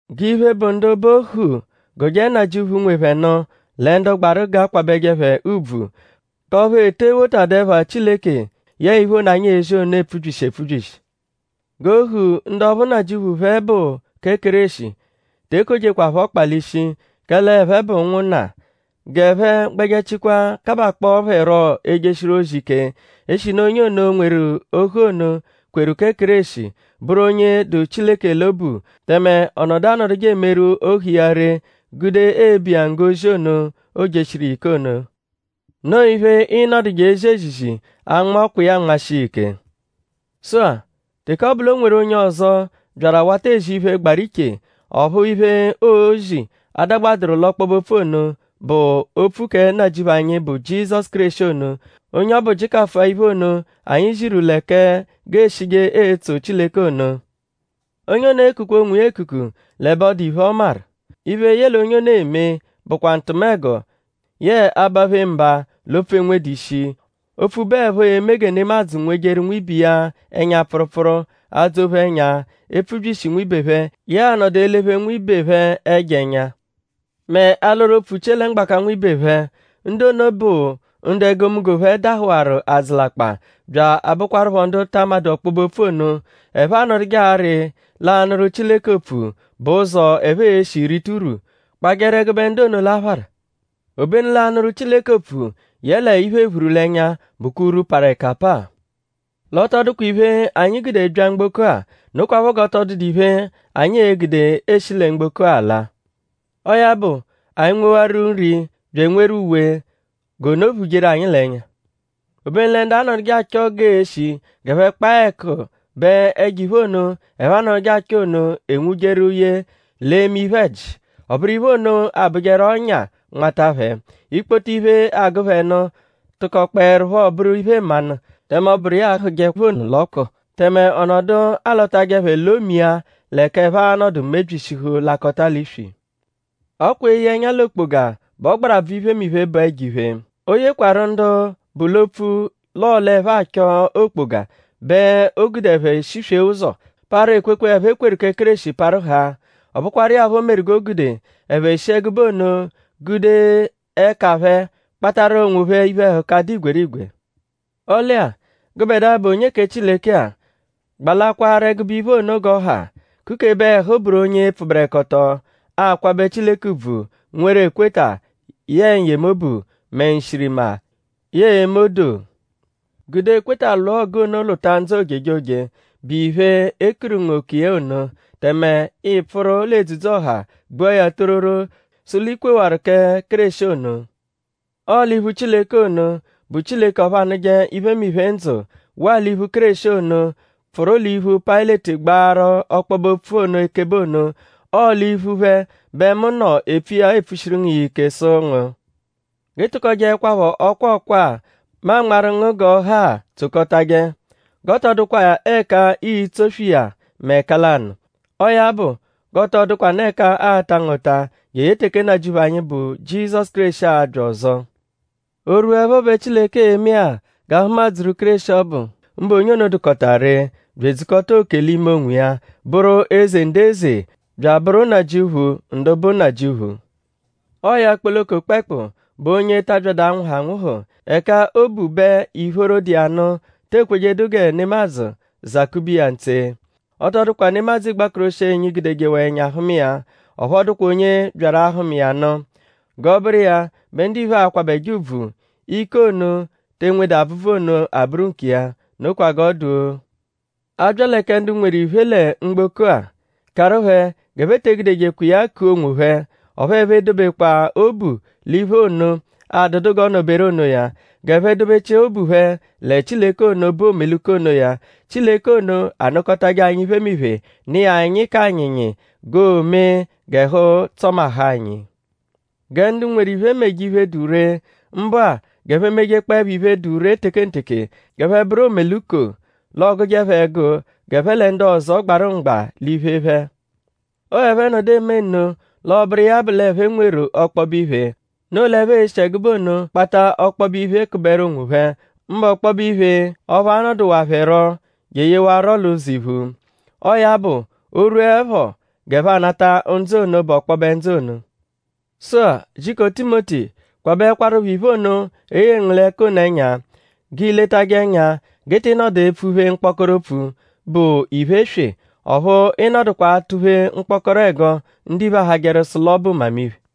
G'iphe, bụ ndu bụ ohu gụje nnajịuphu, nwe phẹ nụ lẹ ndu gbaru g'a kwabẹje phẹ ùbvù; k'ọphu e tee wotadu ẹpha Chileke yẹe iphe ono, anyi ezi ono epfubyishi epfubyishi. G'ohu, ndu ọphu nnajịuphu phẹ bụ kẹ Kéreshi; te ekojekwa phẹ ọkpa l'ishi; kẹle ẹphe bụ ụnwunna. G'ẹphe gbẹjechikwa kabakpọo phẹ rọ ejeshiru ozi ike; eshinu onye ono, nweru ohu ono kweru kẹ Kéreshi; bụru onye dụ Chileke l'obu tẹme ọ nọdu anọduje emeru ohu iya ree gude ebu iya nggo ozi ono, oojeshiru iya ike ono. Noo iphe, ịi-nọduje ezi ezizi; anma ọkwa iya anmashia iya ike. Sụ-a; teke ọ bụ l'o nweru onye ọzo, byaru awata ezi iphe, gbaru iche; ọphu iphe, oozi adagbadụru l'ọkpobe-opfu ono, bụ opfu kẹ Nnajịuphu anyi, bụ Jizọsu Kéreshi ono; onye ọbu jịkafua iphe ono, anyi ziru lẹ kẹ g'ee-shije etso Chileke ono; onye ono ekukwa onwiya ekuku l'ẹbe adụ iphe, ọ maru. Iphe, yẹle onye ono eme bụkwa ntụmego; yẹe abaphe mba l'opfu, enwedu ishi; opfu bụepho eme gẹ nemadzụ nwejeru nwibe iya ẹnya-pfụrupfuru; adzọ-phe ẹnya; epfubyishi nwibe phẹ; yẹe anọdu elephe nwibe phẹ ẹjo ẹnya; mẹ alọru opfu chie lẹ mgbaka nwibe phẹ. Ndu ono bụ ndu egomunggo phẹ dahụwaru adzụlakpa; bya abụkwarupho ndu ta amadụ ọkpobe-opfu ono. Ẹphe anọduje arị l'anụru Chileke opfu bụ ụzo, ẹphe e-shi rita urwu. Kpajẹru ẹgube ndu ono l'aphara. Obenu l'anụru Chileke opfu; yẹle iphe-ephuru-l'ẹnya bụkwa urwu, parụ ẹka apaa. L'ọ tọ dụkwa iphe, anyi gude bya mgboko-a; nokwaphọ g'ọ tọ dụdu iphe, anyi e-gude eshi lẹ mgboko ala. Ọo ya bụ; anyi -nwewaru nri bya enweru uwe; g'ono phujeru anyi l'ẹnya. Obenu lẹ ndu anọduje achọ g'ee-shi g'ẹphe kpaa ẹku bẹ ẹjo-iphe ono, ẹphe anọduje achọ ono enwujeru ye l'eme iphe-ẹji. Ọ bụru iphe ono abụjeru ọ́nyà nmata phẹ. Ikpoto iphe, agụ phẹ nụ tụkokpoerupho bụru iphe-mmanụ; tẹme ọ bụru iya ahụje phẹ ọnu l'ọku; tẹme ọ nọdu alọtaje phẹ lọ-mia l'ẹka ẹphe a-nọdu mebyishihu; lakọta l'iswi. Ọ kwa eye ẹnya l'okpoga bụ ọgbarabvu iphemiphe, bụ ẹjo-iphe. O yekwarụ ndu bụ opfu l'ọo l'ẹphe achọ okpoga bẹ o gude ẹphe shiswee ụzo; parụ ekwekwe, ẹphe kweru kẹ Kéreshi parụ haa. Ọ bụkwaru iya phọ meru g'o gude ẹphe shi ẹgube ono gude ẹka phẹ kpatarụ onwophẹ iphe-ẹhuka, dụ igwerigwe. Ọle-a; gụbedua, bụ onye kẹ Chileke-a; gbalakwaaru ẹgube iphe ono g'ọ ha; kukebe ẹhu bụru onye pfụberekoto; akwabẹ Chileke ùbvù; nweru ekweta; yẹe n-yemobu; mẹ nshirima; yẹe eme odoo. Gude ekweta lwụa ọgu ono lwụta ndzụ ojejoje, bụ iphe, e kuru ngu oku iya ono; tẹme i pfụru l'edzudzu ọha gbua ya tororo sụ l'i kwewaru kẹ Kéreshi ono. Ọo l'iphu Chileke ono, bụ Chileke ọphu anụje iphemiphe ndzụ; waa l'iphu Kéreshi ono, pfụru l'iphu Payịleti gbaaru ọkpobe-opfu ono ekebe ono; ọo l'iphu phẹ bẹ mu nọ epfu iya epfushiru ngu iya ike sụ ngu: g'ị tụkojeekwapho ọkwa ọkwa-a, mu anmarụ ngu g'ọ ha-a tsokọtaje. G'ọ tọ dụkwa ẹka ii-tsoswe iya mẹ ẹka lanụ; ọo ya bụ g'ọ tọo dụkwanu ẹka aa-ta ngu ụta jeye teke Nnajịuphu anyi, bụ Jizọsu Kéreshi a-bya ọzo. O -rwuẹpho bẹ Chileke e-me-a g'a hụma-dzuru Kéreshi ọbu; mbụ onye ono, dụkota ree; bya edzukọta oke l'ime onwiya; bụru Eze ndu eze; bya abụru Nnajịuphu ndu bụ nnajịuphu. Ọo ya kpoloko kpẹekpu bụ onye ta abyadụ anwụhu anwụhu. Ẹka o bu bẹ ìphóró, dụ iya nụ te ekwejedu gẹ nemadzụ zakube iya ntse. Ọ tọ dụkwa nemadzụ igbakoroshienyi gudejewaa ẹnya hụma iya; ọphu ọ dụkwa onye byaru ahụma iya nụ. G'ọ bụru iya bẹ ndiphe a-kwabẹje ùbvù; ike ono, te enwedu abvụbvu ono abụru nkiya. Nokwa g'ọ dụ-o! A bya lẹ kẹ ndu nweru iphe lẹ mgboko-a; karụ phẹ g'ẹphe te egudejekwa iya ku onwophẹ; ọphu ẹphe edobekwa obu l'iphe ono, adụdu g'ọo-nọ-beru onoya. G'ẹphe dobechia obu phẹ lẹ Chileke ono, bụ omeluko onoya. Chileke ono anụkotaje anyi iphemiphe; nụ iya anyi k'anyịnyi g'oomee g'ẹhu tsọmahu anyi. Gẹ ndu nweru iphe meje iphe, dụ ree; mbụ-a; g'ẹphe mejekpọo iphe, dụ ree tekenteke; g'ẹphe bụru omeluko; l'ọ gụje phẹ ẹgu g'ẹphe lẹ ndu ọzo gbarụ mgba l'iphe phẹ. Ọo ẹphe -nọdu eme nno l'ọ bụru iya bụ l'ẹphe nweru ọkpobe iphe. Noo l'ẹphe e-shi ẹgube ono kpata ọkpobe iphe kụberu onwophẹ; mbụ ọkpobe iphe ọphu a-nọduwaru phẹ rọ jeyewarụro l'ụzo iphu. Ọo ya bụ; o -rwuẹpho; g'ẹphe anata ndzụ ono, bụ ọkpobe ndzụ ono. Sụ-a; jiko Timoti; kwabẹekwarupho iphe ono, e yeru ngu l'ẹka ono ẹnya. G'i letajẹ ẹnya g'ị tị nọdu epfuphe mkpọkoro opfu, bụ iphe eswe; ọphu ị nọdukwa atụ-phe mkpọkoro ẹgo, ndiphe ahajẹru sụ l'ọ bụ mmamiphe.